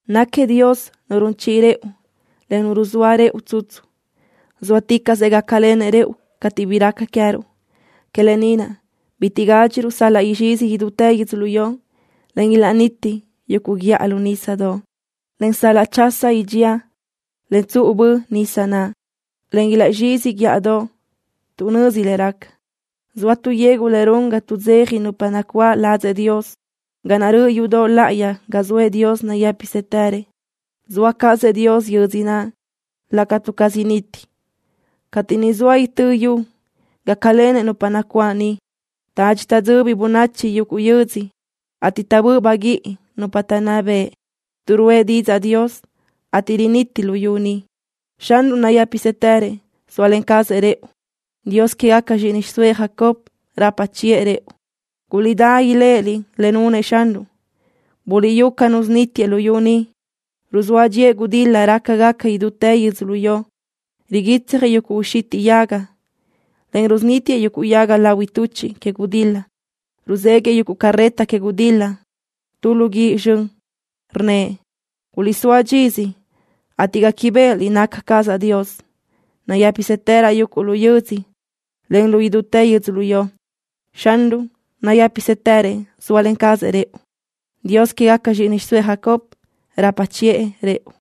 ¡Náquiëʼ Dios Nu run chiʼi rëʼu, en Nu ruzóa rëʼu tsutsu! ¡Zóaticaʼsëʼ gácalenëʼ rëʼu cateʼ bi raca queë́ruʼ! Que lë ni naʼ bitiʼ gádxiruʼ sal-laʼ izxizi idútë yödzölió, en ilaʼniti yuguʼ guíʼa lu nísadoʼ, en sal-laʼ chasa idxía, en tsuʼu bö nísadoʼ naʼ, en ilaʼzxizi guíʼadoʼ tuʼ nözi le raca. Zoa tu yegu le run ga tuʼdzeja nupa nacuáʼ ladzëʼ Dios, ga naʼ röʼö yudoʼ láʼayi ga zoëʼ Dios nayë́pisëtërëʼ. Zoa cazëʼ Dios yödzö naʼ, le catu caz initi. Cateʼ niʼ soa itö́ yu gácalenëʼ nupa nacuáʼ niʼ. Tadxi taʼdzöbi bönachi yuguʼ yödzö, ateʼ taʼbö́ʼ baguíʼi nupa taʼnná bëʼ, tuʼ ruʼë didzaʼ Dios, ateʼ riniti luyú ni. Xanruʼ nayë́pisëtërëʼ zóalen cazëʼ rëʼu. Dios quégaca zxíʼini xiʼsóëʼ Jacob rapa chiʼë rëʼu. Guliʼdá iléʼeliʼ le nunëʼ Xanruʼ. Buliʼyú ca nusunítiëʼ luyú ni. Ruzóa dxíëʼ gudil-la rácagaca idútë yödzölió. Riguitsjëʼ yuguʼ uxitiʼ yaga, en rusunítiëʼ yuguʼ yaga lahui tuchiʼ que gudil-la. Ruzéguiʼë yuguʼ carreta que gudil-la tu lu guíʼ zxön. Rnnëʼ: “Guliʼsóa dxisö, ateʼ guéquibeʼeliʼ naca cazaʼ Dios. Nayë́pisëtëraʼ yuguʼ lu yödzö, en lu idútë yödzölió.” Xanruʼ nayë́pisëtërëʼ zóalen cazëʼ rëʼu. Dios quégaca zxíʼini xiʼsóëʼ Jacob rapa chiʼë rëʼu.